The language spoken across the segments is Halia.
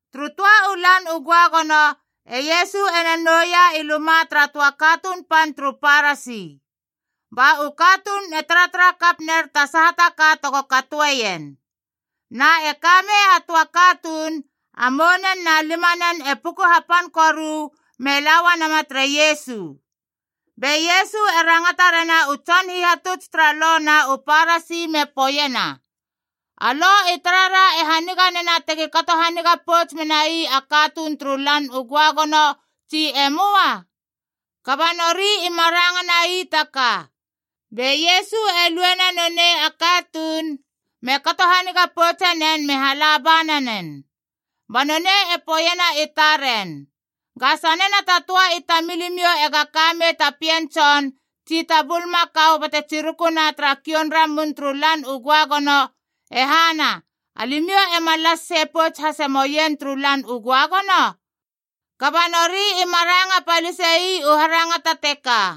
Turu töa u Lan u Göagono, e Iesu ena nouia i luma tara töa katuun pan turu Parasi. Ba u katuun e taratara kap ner ta saha ka tego katoeien. Na e kamei a töa katuun, a mounen na limanen e puku hapan koru me laua nama tere Iesu. Be Iesu e rangata rena u tson hihatuts tara Lo na u Parasi me poeiena, “A Lo i tarara e haniga nena tegi kato haniga pouts menai a katuun turu Lan u Göagono, tsi e möa?” Kaba nori ima ranga nai ta ka. Be Iesu e luena nonei a katuun, me kato haniga poutsenen nen me hala ba nanen. Ba nonei e poeiena i taren, “Ga sanena ta töa i tamilimiou ega ka mei ta pien tson tsi ta bulmakau bate tsirukuna tara kioun ramun turu Lan u Göagono, e hana alimiou ema las sei pouts hase moien turu Lan u Göagono?” Kaba nori ima ranga palise ii u harangata teka.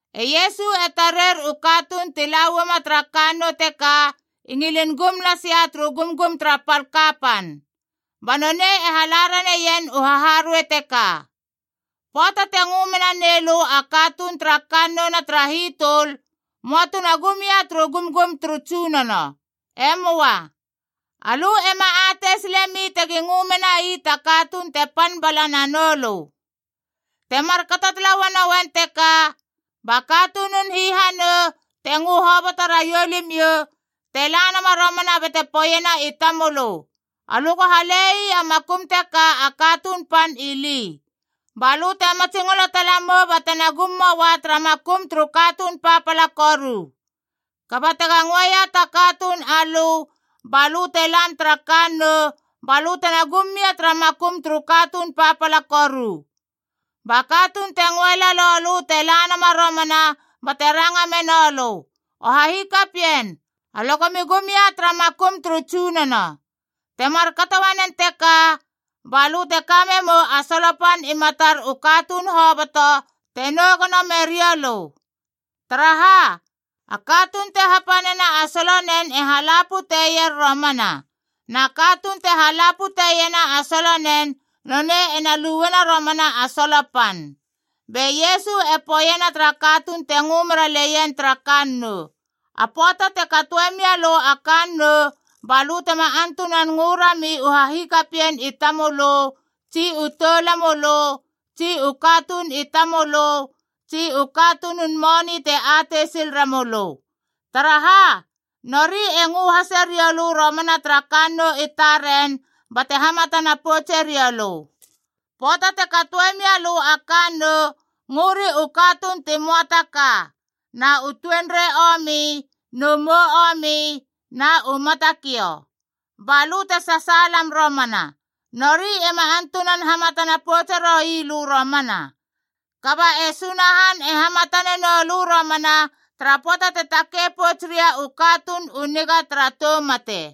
E Iesu e tarer u katuun ti la uama tara kannou teka i ngilin gum lasia turu gumgum tara pal kapan. Ba nonei e hala raneien u haharuei teka. “Pöata te ngö mena nei lö a katuun tara kannouna tara hitöl, möa tuna gum ia turu gumgum turu tsunono. E möa. Alö ema atei silemi tegi ngö menai ta katuun te pan bala nanoulö. Te markato tala uanouen teka, ba katunun hihanou, te ngö hoboto raiou limiou, te la nama romana bate poeiena i tamölö, ‘Alö go hale ii a makum teka a katuun pan ili.’ Ba lö te matsingolo tala mou batena gum moua tara makum turu katuun papala koru. Kaba tega ngöeia ta katuun alö ba lö te lam tara kannou, ba lö tena gum mia tara makum turu katuun papala koru. Ba katuun te ngöe lalou lö te la nama romana bate ranga menoulö, ‘O hahikapien, alö gomi gum ia tara makum turu tsunono.’ Te markato uanen teka, ba lö te ka memou a solo pan i matar u katuun hoboto te nou gono merioulö. Taraha? A katuun te hapanena a solonen e hala puteier romana. Na katuun te hala puteiena a solonen, nonei ena luena romana a solo pan.” Be Iesu e poeiena tara katuun te ngö meraleien tara kannou, “A pöata te katoe mia lö a kannou, ba lö tema antunan ngö rami u hahikapien i tamölö, tsi u toulamölö, tsi u katuun i tamölö, tsi u katunun moni te atei sil remölö. Taraha? Nori e ngö hase riou lö romana tara kannou i taren bate hamatana poutse rioulö. Pöata te katoe mia lö a kannou, ngöri u katuun ti möa ta ka, na u tuenrei omi, nu mou omi, na u matakiou. Ba lö te sasaalam romana. Nori ema antunan hamatana poutse roui lö romana. Kaba e Sunahan e hamatane nou lö romana tara pöata te takei pouts ria u katuun u niga tara tou mate.”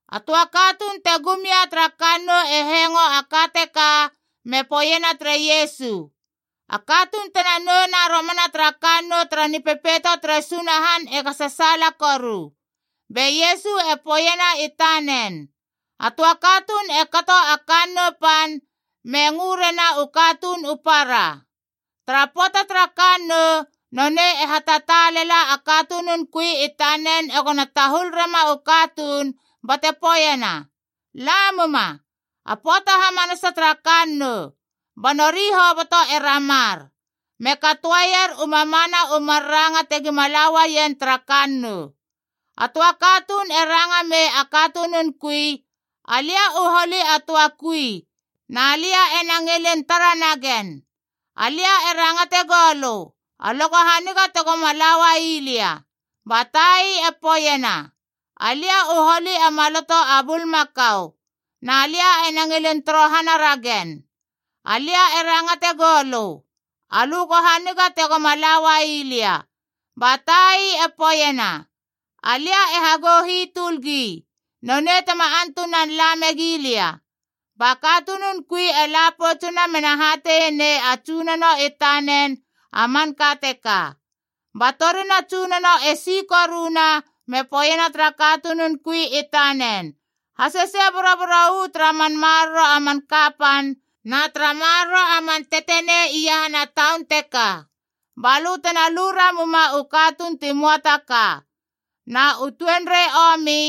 A töa katuun te gum ia tara kannou e hengo a ka teka me poeiena tere Iesu, “A katuun tena nouna romana tara kannou tara Nipepeito tere Sunahan ega sasaala koru.” Be Iesu e poeiena i tanen, “A töa katuun e kato a kannou pan, me ngö rena u katuun u para. Tara pöata tara kannou, nonei e hatataalela a katunun kui i tanen egona tahul rema u katuun bate poeiena, ‘La muma, a pöata hamanasa tara kannou!’ Ba nori hoboto e ramar, me katoeier u mamana u mar ranga tegima la uaien tara kannou. A töa katuun e ranga mei a katunun kui, ‘Alia u holi a töa kui, na lia ena ngilin tara nagen. Alia e rangate goulö, alö go haniga tegoma la uai lia.’ Ba tai e poeiena, ‘Alia u holi a maloto a bulmakau, na lia ena ngilin torohana ragen. Alia e rangate goulö, alö go haniga tegoma la uai lia.’ Ba tai e poeiena, ‘Alia e hagou hitöl gi, nonei tema antunan la megi lia.’ Ba katunun kui e la poutsuna mena hateie nei a tsunono i tanen a manka teka. Ba torina a tsunono e si koruna me poeiena tara katunun kui i tanen, ‘Hasesei boroboro uu tara man maroro a man kapan na tara maroro a man tetenei iahana taun teka. Ba lö tena lu ramuma u katuun ti möa ta ka, na u tuenrei omi,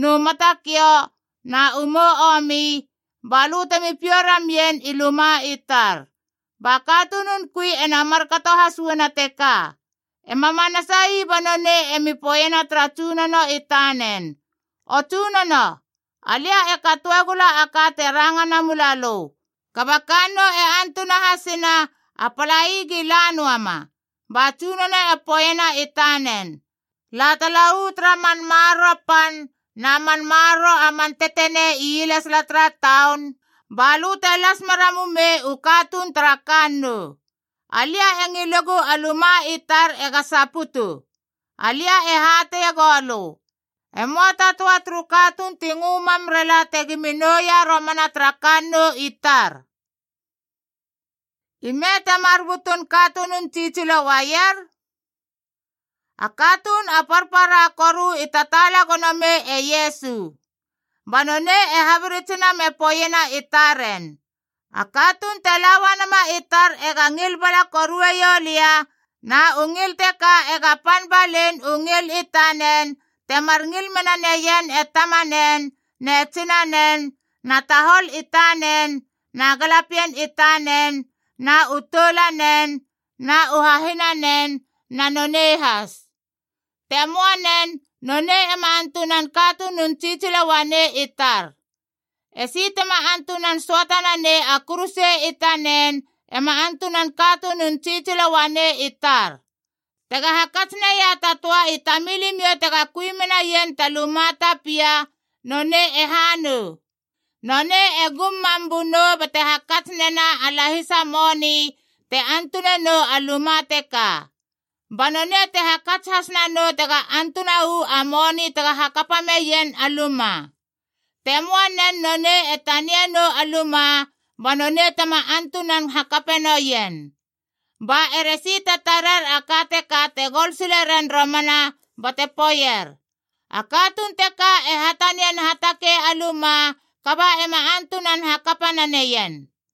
nu matakiou, na u mou omi, ba lö temi piou ramien i luma i tar.’ Ba katunun kui ena markato has uana teka. E ma manasai ba nonei emi poeiena tara tsunono i tanen, ‘O tsunono, alia e katoe gula a ka te ranga namula lö, kaba a kannou e antuna hasina, a palai gi la noama.’ Ba tsunono e poeiena i tanen, ‘La tala uu tara man maroro pan na man maroro a man tetenei ielesala tara taun, ba lö te las mera mumei u katuun tara kannou. Alia e ngilegu a luma i tar ega saputu. Alia e hateie goulö, e möa ta töa turu katuun ti ngö mam rela tegimi nouia romana tara kannou i tar!’” Ime temar butun katunun tsitsilo uaier? A katuun a parpara koru i tataala gono mei e Iesu. Ba nonei e habiritsina me poeiena i taren, “A katuun te la uanama i tar ega ngil bala korue ioulia, na u ngil teka ega pan balein u ngil i tanen temar ngil mena neien e tamanen ne tsinanen na tahol i tanen na galapien i tanen, na u toulanen na u hahinanen na nonei has. Te möa nen, nonei ema antunan katunun tsitsilo uanei i tar. Esi tema antunan söata nanei a kuruse i tanen ema antunan katunun tsitsilo uanei i tar. Tega hakats naia ta töa i tamilimiou tega kui menaien ta luma ta pia, nonei e ha nou? Nonei e gum mam bunou bate hakats nena a lahisa moni te antunenou a luma teka. Ba nonei te hakats has nanou tega antuna uu a moni tega hakapa meien a luma. Te möanen, nonei e tanie nou a luma, ba nonei tema antunan hakape noien. Ba eresi te tarer a ka teka te gol sile ren romana bate poeier, ‘A katuun teka e hatanian hatakei a luma, kaba ema antunan hakapa naneien!’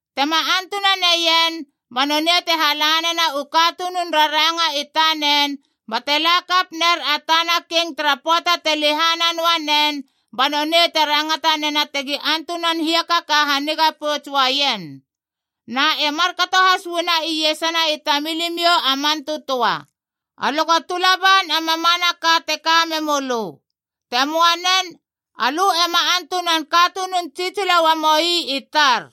Tema antuna neien, ba nonei te hala nena u katunun raranga i tanen bate la kap ner a tana king tara pöata te lehana noa nen, ba nonei te rangata nena tegi antunan hiakaka haniga pouts uaien. Na e markato has uana iesana i tamilimiou a man tötöa. Alö go tula ban a mamanaka te ka memölö. Te möa nen, alö ema antunan katunun tsitsilo uamoi i tar.”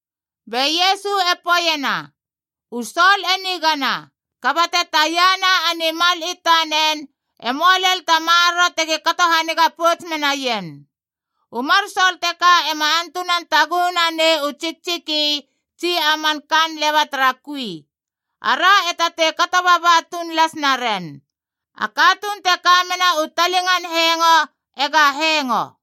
Be Iesu e poeiena, “U sol e nigana, kaba te taia na a nimal i tanen, e möa lel ta maroro tegi kato haniga pouts menaien. U mar sol teka ema antunan taguhu nanei u tsiktsiki tsi a man kaan leba tara kui. Ara e tatei kato baba tuun las naren. A katuun te ka mena u talingan hengo ega hengo!”